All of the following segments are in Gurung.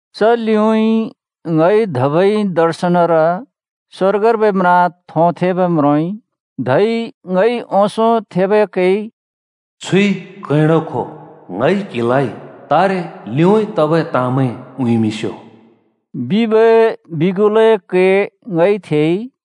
च लिउँइँ ङइ धबै दर्शनर स्‍वर्गर्बै म्रा थोंथेंब् म्रोंइ। धै ङइ ओंसों थेबै कैइ “छुइ कैंडो खो, ङइ क्हिलाइ तारे लिउँइँ तबै ताँमैं उँइँमिंस्‍यो” बिबै बिगुलए कै ङइ थेइ।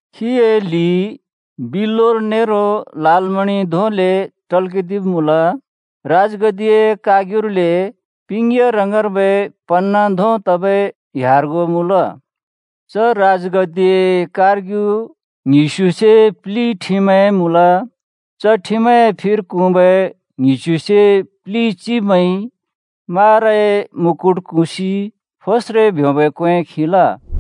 खीए लि बिल्‍लौर नेरो लालमणि धोंले टल्‍कदिब् मुँल। राजगद्दिए कारग्युले पिंग्‍या रङर्बै पन्‍ना धों तबै ह्‍यार्गों मुँल। च राजगद्दिए कारग्यु ङ्हिस्यु से प्लि ठिमैं मुँल। च ठिमैंए फिर क्हुँबै ङ्हिस्युसे प्लि चिब्मैंइ माराए मुकुट कुसि फोस्रे ब्योंबै क्‍वें खिल।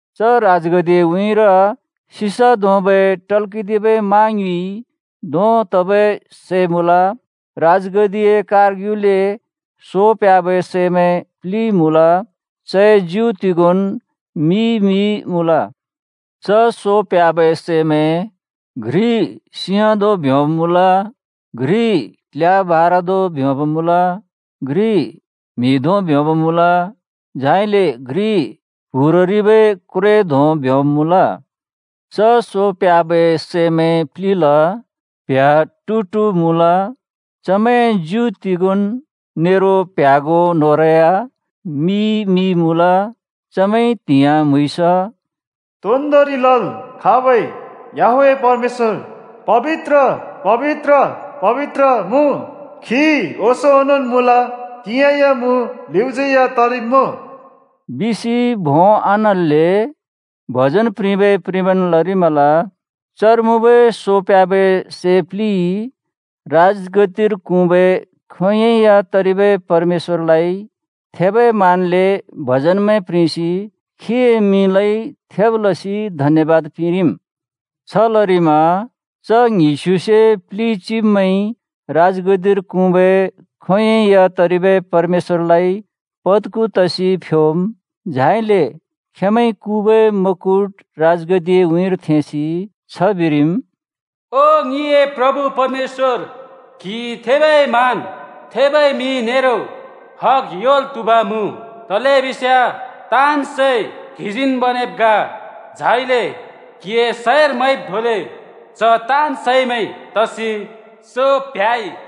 च राजगद्दिए उँइँर सिसा धोंबै टल्‍कदिबै मा ङ्युँइ धों तबै सै मुँल। राजगद्दिए कारग्युले सो प्ह्‍याबै सैमैं प्लि मुँल। चए ज्यु तिगोंन् मि-मि मुँल। च सो प्ह्‍याबै सैमैं घ्रि सिंह धों ब्‍योंब् मुँल। घ्रि क्ल्या भारा धों ब्योंब् मुँल। घ्रि म्‍हि धों ब्योंब मुँल। झाइले घ्रि प्‍हुररिबै क्व्रे धों ब्योंब् मुँल। च सो प्ह्‍याबै सैमैं प्लिल प्‍ह्‍या टु-टु मुँल, चमैंए ज्यु तिगोंन् नेरो प्‍ह्‍यागों न्होंरै या मि-मि मुँल। चमैंइ त्‍हिंयाँ म्‍हुँइँस “तोन्दोंरि लल् खाँबै याहवेह परमेश्‍वर पबित्र, पबित्र, पबित्र मुँ। खी ओंसों ओनोंन् मुँल, तिंयाँ या मुँ, लिउँज्‍यै या तरिब्‍मुँ।” बिसि भों आन्हल्‍ले भजन प्रिंबै प्रिंबन् लरिमल। चर मुँबै सो प्ह्‍याबै सै प्लिइ राजगद्दिर क्हुँबै खोंयोंइ या तरिबै परमेश्‍वरलाइ थेबै मानले भजनमैं प्रिंसि खीए मिंलाइ थेब् लसि धन्‍यबाद पिंरिम्। छ लरिमा च ङ्हिस्युसे प्लि चिब्मैंइ राजगद्दिर क्हुँबै खोंयोंइ या तरिबै परमेश्‍वरलाइ पद्खु तसि फ्योम्, झाइले खेंमैंइ कुबै मुकुट राजगद्दिए उँइँर थेंसि छ बिरिम्, “ओ ङिए प्रभु परमेश्‍वर, क्‍हि थेबै मान, थेबै मिं नेरो हग योंल् त्हुब मुँ। तलेबिस्याँ ताँन् सै क्‍हिजीन् बनेब् ग, झाइले क्‍हिए सैंर मैंब् धोंले च ताँन् सैमैं तसि सो प्ह्‍याइ।”